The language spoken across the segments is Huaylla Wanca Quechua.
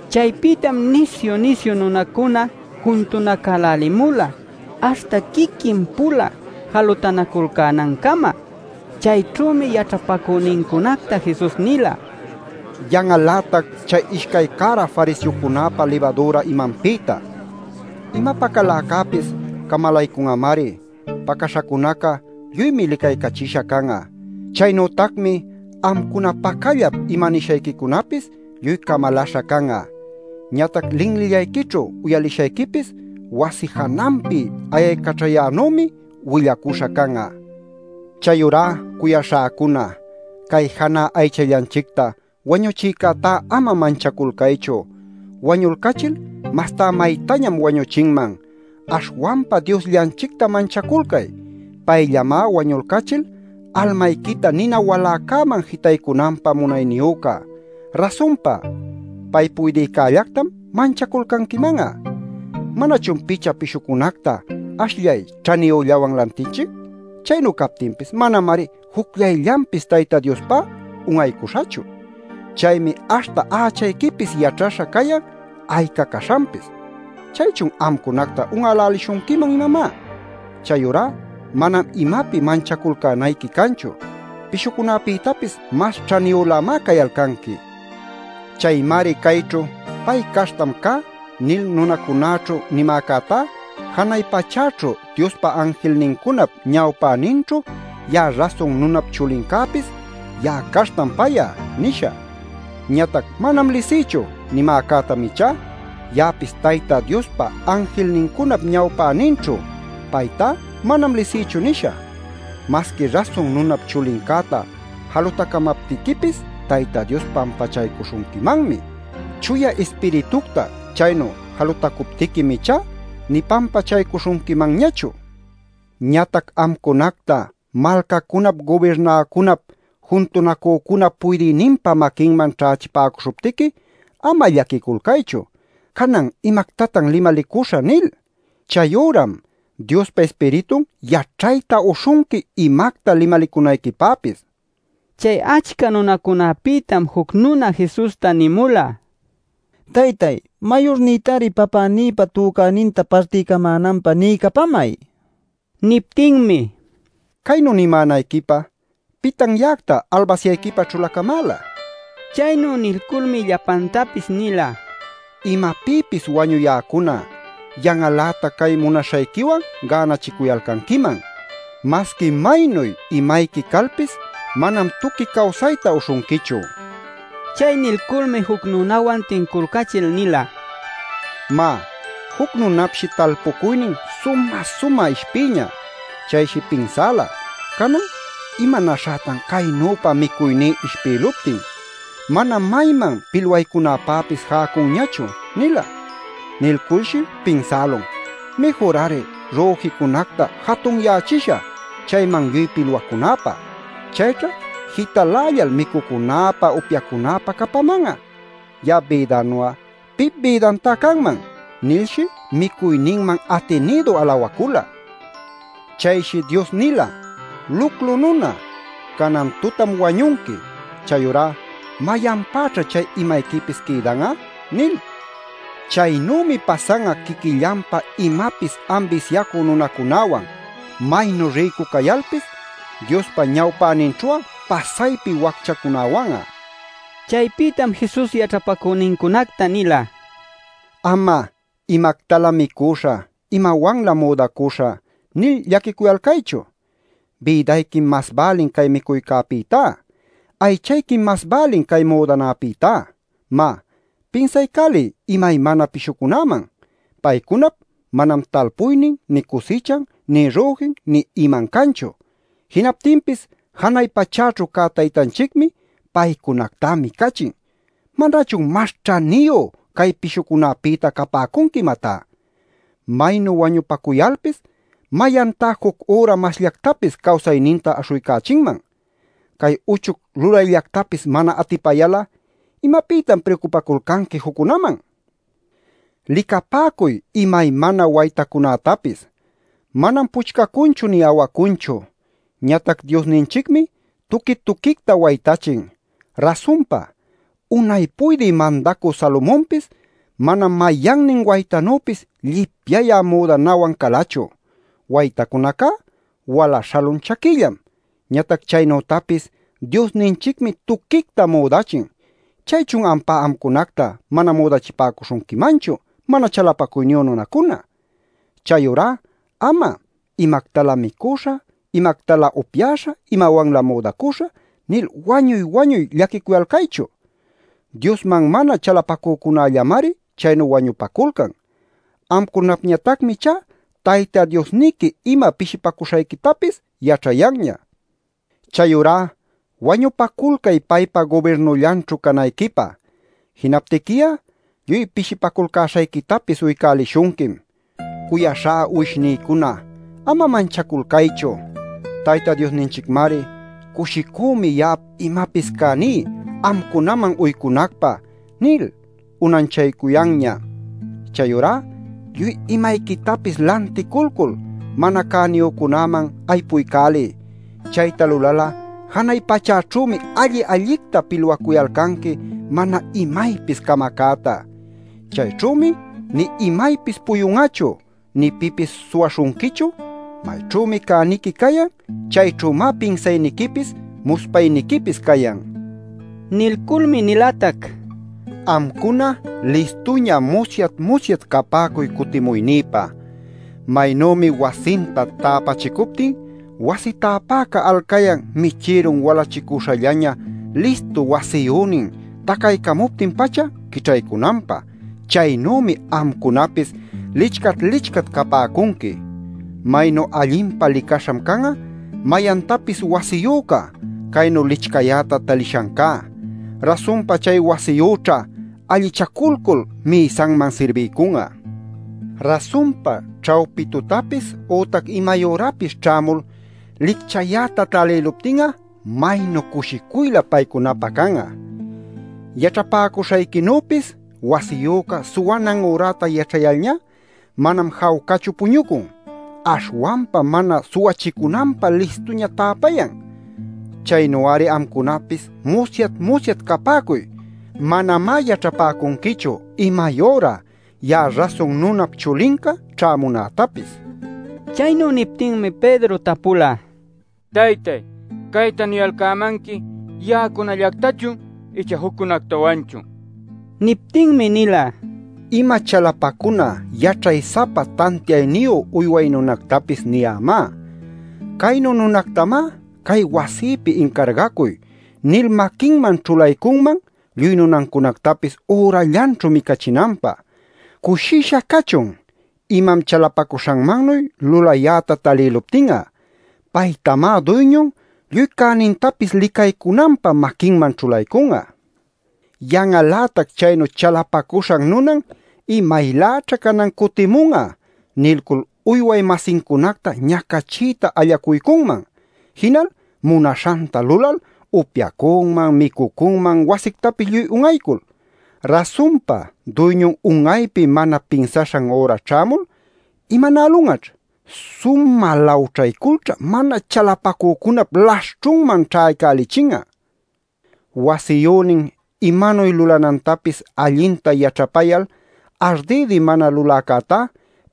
Chaypïtam nisyu-nisyu nunacuna juntunacälälimula aśhta quiquin-pula jalutanaculcänancama. Chayćhümi yaćhapacünincunacta Jesus nila: “¡Yan'al-lätac chay ishcay cära fariseocunäpa libadüra imanpïta! Ima pacaläcäpis camalaycun'amari. Pacaśhacunaca lluymi licaycachisha can'a. Chaynütacmi amcuna pacallap ima nishayquicunapis lluy camalaśha can'a. Ñatac linlillayquićhu uyalishayquipis wasi jananpi ayaycaćhayänümi willacuśha can'a. “Chayurá cuyaśhäcuna, cay janä aychallanchicta wañuchïcätá ama manchaculcaychu; wañulcachil mastá maytañam wañuchinman. Aśhwanpa Diosllanchicta manchaculcay. Payllamá wañulcachil almayquita nina waläcäman jitaycunanpä munayniyüca. Rasunpa, pay puydïcällactam manchaculcanquiman'a. “¿Manachun picha pishucunacta ashllay ćhaniyüllawan lantinchic? Chaynu cayaptinpis manamari jucllayllanpis Tayta Diospá un'aycuśhachu. Chaymi aśhta ächayquipis yaćhaśha cayan ayca caśhanpis. ¿Chaychun amcunacta un'älälishunquiman, imamá? Chayurá manam imapi manchaculcänayqui canchu. Pishucunapïtapis mas ćhaniyülämá cayalcanqui. “Chaymari cayćhu ‘Pay caśhtam cá’ nil nunacunäćhu nimäcätá, janay pachäćhu Diospa anjilnincunap ñawpäninćhu ya'a Rasun Nunap Chulincäpis ‘Ya'a caśhtam pay'a’ nishä. Ñatac ‘Manam lisïchu’ nimäcätam ichá, ya'apis Tayta Diospa anjilnincunap ñawpäninćhu ‘Paytá manam lisïchu’ nishä. Masqui Rasun Nunap Chulincäta jalutacamaptiquipis Tayta Dios pampachaycuśhunquimanmi. Chuya Ispiritucta chaynu jalutacuptiquim ichá nï pampachaycuśhunquimanñachu. “Ñatac amcunacta malcacunap gubirnäcunap juntunacücunap puydïninpa maquinman ćhächipäcuśhuptiqui, ama llaquiculcaychu ‘canan ¿imactatan limalicuśhä?’ nil. Chay üram Diospa Ispiritun yaćhayta uśhunqui, imacta limalicunayquipäpis” nil. Chay achca nunacunapïtam juc nuna Jesusta nïmula: “Taytay, mayurnïtari papänïpa tücäninta partiycamänanpä niycapämay” nil. Niptinmi: “Caynu nimänayquipä ¿pitan ya'acta albasyayquipä ćhulacamäla?” nila. Chaynu nilculmi llapantapis nila: “Imapïpis wañuyäcuna, yan'al-lätac cay munaśhayquiwan gänachicuyalcanquiman. Masqui maynuy imayqui calpis manam tuqui cawsayta uśhunquichu” nil. Chay nilculmi juc nunawan tinculcachil nila: “Má, juc nunapshi talpucuynin sumä-sumä ishpïñä. Chayshi pinsäla: ‘Canan ¿imanäśhätan caynüpa micuyní ishpïluptin? Manam mayman pilwaycunäpäpis jäcunñachu’ nila. Nilculshi pinsälun: ‘Mïjur-ari, rüjïcunacta jatunyächishä chayman lluy pilwacunäpä. Chayćha jitalällal micucunäpä upyacunäpä capaman'a. Ya'ap bïdanu'a pip bïdantá canman’ nilshi micuyninman atinïdu alawacula. Chayshi Dios nila: ‘Luclu nuna, canan tutam wañunqui. Chayurá ¿mayanpäćha chay imayquipis quïdan'a?’ nil. Chaynümi pasan'a quiquillanpä imapis ambisyacü nunacunäwan, maynu rïcu cayalpis Diospa ñawpäninćhu'a pasaypi wacchacunawan'a” nil. Chaypïtam Jesus yaćhapacünincunacta nila: “Ama ‘¿Imactalä micuśhä; imawanlä müdacuśhä?’ nil llaquicuyalcaychu. Bïdayquim mas bälin cay micuycäpïtá; aychayquim mas bälin cay müdanapïtá. Má, pinsaycäliy imaymana pishucunäman. Paycunap manam talpuynin nï cusichan nï rüjin nï iman canchu. Jinaptinpis janay pachäćhu cä Taytanchicmi paycunactá micachin. ¿Manachun mas ćhaniyu cay pishucunapïta capäcunqui imatá? Maynu wañupacuyalpis ¿mayantá juc üra masllactapis cawsayninta aśhuycächinman? Cay uchuc lulayllactapis mana atipayal'a ¿imapïtam priucupaculcanqui juccunaman? “Licapäcuy imaymana waytacunätapis. Manam puchcacunchu nï awacunchu. Ñatac Diosninchicmi tuqui-tuquicta waytachin. Rasunpa, unay puydï mandacü Salomonpis manam mayannin waytanüpis llipyayä müdanawan calachu. Waytacunacá wala śhalun chaquillam, ñatac chaynütapis Diosninchicmi tuquicta müdachin. ¿Chaychun ampá amcunacta mana müdachipäcuśhunquimanchu, mana chalapacuyniyu nunacuna? “Chayurá ama ‘¿Imactalä micüśhä, imactalä upyäśhä, imawanlä müdacüśhä?’ nil wañuy-wañuy llaquicuyalcaychu. Diosman mana chalapacücunallamari chaynu wañupaculcan. Amcunapñatacmi ichá Tayta Diosniqui ima pishipacuśhayquitapis yaćhayanña. Chayurá wañupaculcay paypa gubirnullanćhu canayquipä. Jinaptiqui'a lluy pishipaculcäśhayquitapis uycälishunquim. “Cuyaśhá uwishnïcuna, ama manchaculcaychu. Tayta Diosninchicmari: ‘Cushicümi ya'ap imapis cäní amcunaman uycunacpä’ nil unanchaycuyanña. Chayurá lluy imayquitapis lanticulcul mana cäniyücunäman aypuycäliy. Chayta lulal'a janay pachäćhümi alli-allicta pilwacuyalcanqui mana imaypis camacäta. Chayćhümi nï imaypis puyun'achu nï pipis suwaśhunquichu. Mayćhümi cäniqui cayan; chayćhümá pinsayniquipis muspayniquipis cayan” nila. Nilculmi nilatac: “Amcuna listuña musyat-musyat capäcuy cutimuynïpa. Maynümi wasinta täpachicuptin wasi täpäca alcayan michïrun walachicuśhallaña listu wasiyünin tacaycamuptin-pacha quićhaycunanpä, chaynümi amcunapis licchat-licchat capäcunqui. Maynu allinpa licaśham can'a mayantapis wasiyüca caynu licchayäta talishancá. Rasunpa chay wasiyüćha allichaculcul mïsanman sirbiycun'a. Rasunpa ćhawpi tutapis ütac imay ürapis ćhämul licchayäta talïluptin'a maynu cushicuylä paycunapä can'a. “Yaćhapäcuśhayquinüpis, wasiyüca suwanan üräta yaćhayalñá manam jawcachu puñucun, aśhwanpam mana suwachicunanpä listuña täpayan. Chaynu-ari amcunapis musyat-musyat capäcuy; manamá yaćhapäcunquichu imay üra ya'a Rasun Nunap Chulinca ćhämunätapis” nila. Chaynu niptinmi Pedro tapula: “Taytay, ¿cayta niyalcämanqui ya'acunallactachun icha juccunactawanchun?” nil. Niptinmi nila: “Ima chalapacuna yaćhay-sapa tantiayniyu uyway nunactapis niyämá. Caynu nunactamá ‘cay wasïpi incargacuy’ nil maquinman ćhulaycunman lluy nunancunactapis ürallanćhu micachinanpä. Cushisha cachun imam chalapacuśhanmannuy lulayäta talïluptin'a. Paytamá duyñun lluy cänintapis licaycunanpä maquinman ćhulaycun'a. “Yan'al-lätac chaynu chalapacuśhan nunan ‘¿Imayläćha canan cutimun'a?’ nilcul uyway-masincunacta ñacachiyta allacuycunman. Jinal munaśhanta lulal upyacunman micucunman wasictapis lluy un'aycul. Rasunpa duyñun un'aypi mana pinsaśhan üra ćhämul ¿imanälun'aćh? Sumä lawćhayculćhá mana chalapacücunap laśhćhunman ćhaycälichin'a. Wasiyünin imanuy lulanantapis allinta yaćhapayal, ardïdi mana luläcätá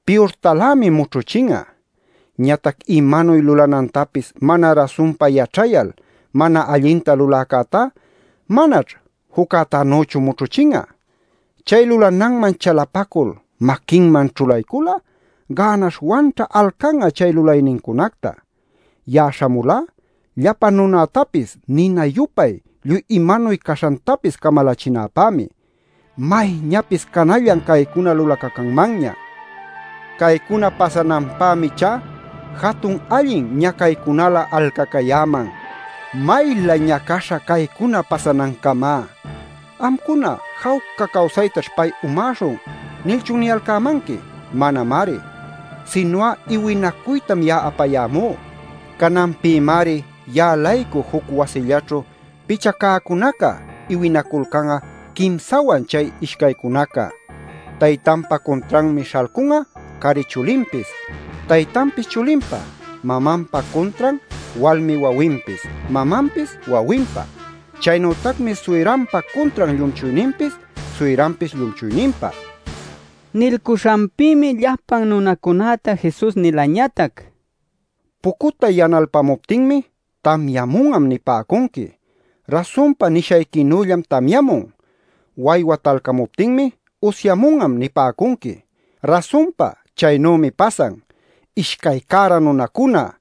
piyurtalämi mućhuchin'a. Ñatac imanuy lulanantapis mana rasunpa yaćhayal, mana allinta luläcätá manaćh juccätanüchu mućhuchin'a. Chay lulananman chalapacul maquinman ćhulaycul'a gänaśhwanćha alcan'a chay lulaynincunacta. “Ya'a śhamulá llapa nunätapis nina-yupay lluy imanuy caśhantapis camalächinäpämi. ¡Mayñapis canallan caycuna lulacacanmanña! Caycuna pasananpämi ichá jatun allin ñacaycunalä alcacayäman. ¡Maylä ñacaśha caycuna pasanancamá! “¿Amcuna ‘Jawca cawsaytaćh pay umäśhun’ nilchun niyalcämanqui? Manamari. Sinu'a iwinacuytam ya'a apayämú. Cananpïmari ya'a-laycu juc wasillaćhu picha cäcunaca iwinaculcan'a quimsawan chay ishcaycunaca. Taytanpa cuntranmi śhalcun'a cari chulinpis, taytanpis chulinpa. Mamanpa cuntran walmi wawinpis; mamanpis wawinpa. Chaynütacmi suyranpa cuntran llumchuyninpis, suyranpis llumchuyninpa” nila. Nilcuśhanpïmi llapan nunacunäta Jesus nilañatac: “Pucutay yanalpamuptinmi, ‘tamyamun'am’ nipäcunqui. Rasunpa nishayquinüllam tamyamun. Waywa talcamuptinmi ‘usyämun'am’ nipäcunqui. Rasunpa chaynümi pasan. ¡Ishcay cära nunacuna!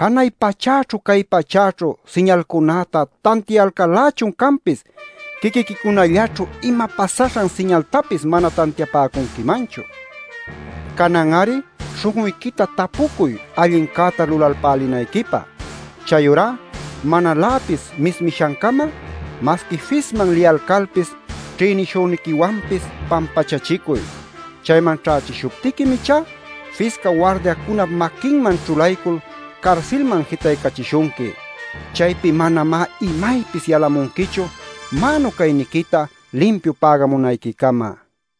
¡Janay pachäćhu cay pachäćhu siñalcunäta tantiayalcal-lächun canpis, quiquiquicunallaćhu ima pasaśhan siñaltapis mana tantiapäcunquimanchu! Canan-ari śhun'uyquita tapucuy allincäta lulalpälinayquipä. Chayurá manaläpis mismishancama masqui fisman liyalcalpis ćhïnishüniquiwanpis pampachachicuy. Chayman ćhächishuptiquim ichá fisca wardiacunap maquinman ćhulaycul carsilman jitaycachishunqui. Chaypi manamá imaypis yalamunquichu mänu cayniquita limpiu pägamunayquicama” nila.